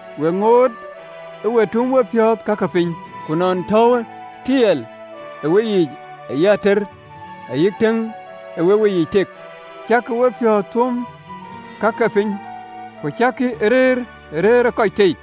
we ŋoot ë we tum wepiɔ̈ɔ̈th ka ke piny. Ku nɔn tɔ̈uwë tiɛɛl ë weyiic ayï ateer ayï tëŋ aa wek weyiic tek, cäkï wepiɔ̈ɔ̈th ë tuöm ka ke piny, ku cäkï ë rëër ë rëër ë kɔc tei?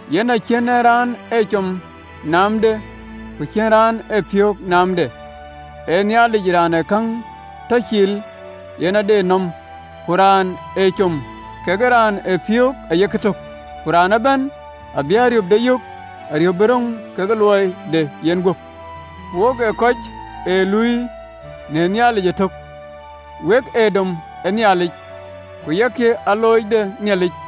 Yen acïn raan ee com naamde, ku cïn raan ee piöök naamde, ee Nhialic raan ee käŋ tɔ cil, yen ade nɔm. Ku raan ë com kekë raan ë piöök ayek tök, ku raan ëbɛ̈n abï ariöpde yök, ariöp bï röŋ ke luɔide yenguöp. Wok ee kɔc ë luui në Nhialic ëtök: wek ee dom ë Nhialic. Ku yak alooc de Nhialic.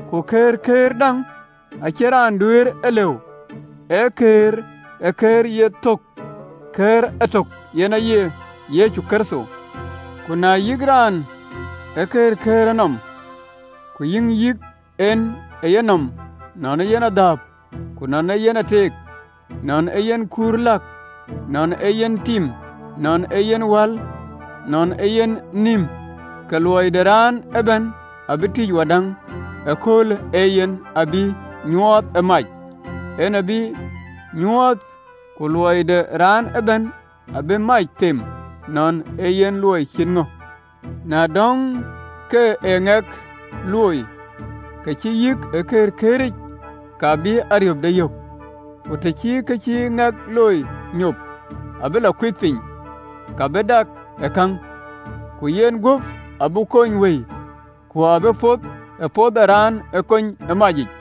Ku këërkëër däŋ acïn raan duëër e lëu ë kɛ̈ɛ̈r, ee kë ye thök ë kɛ̈ɛ̈r etök, yen aye Yecu Kërtho. Ku na yïk raan ë këërkëërë nɔm, ku yïŋ yïk en ë yenɔm, nɔn ee yen adhääp, ku nɔn ee yen ateek, nɔn ee yen kuur läk, nɔn ee yen tim, nɔn ee yen wal, nɔn ee yen anin, ke luɔi de raan ëbɛ̈n abï tïc wadäŋ: ee köölë yen abï e nyuɔɔth, ee mac en abï e nyuɔɔth, ku luɔi de raan ëbɛ̈n abïï mac them, nɔn ee yen luɔi cït ŋö. Na dɔ̈ŋ kë ë ŋɛk looi, kë cï yïk ë këërkëër, ka bï ariöpde yök. Ku të cï kë cï ŋɛk looi nyop abï lɔ kuith piny, ka bï dak ë käŋ, ku yen guöp abï kony wëi, ku abï poth ë poth ë raan ë kony ë macic.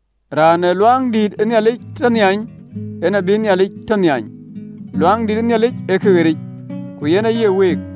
Raan ee luaŋdïït ë Nhialic tɔ nhiany, en abïï Nhialic tɔ nhiany: luaŋdïït ë Nhialic ee kë ɣeric, ku yen aye week.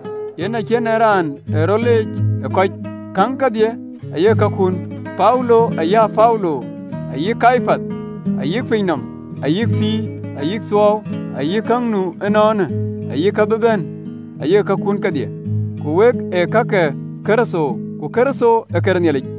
Yen cïn en raan ee rɔt leec ë kɔc. Käŋ kedhie ayek kakun. Paulo, ayï Apolo, ayï Kepath, ayï piny nɔm, ayï pïïr, ayï thuɔɔu, ayï ka nu ënɔɔnë, ayï ka bï bɛ̈n, ayek kakun kedhie, ku wek ee ka ke Kërtho, ku Kërtho ee këde Nhialic.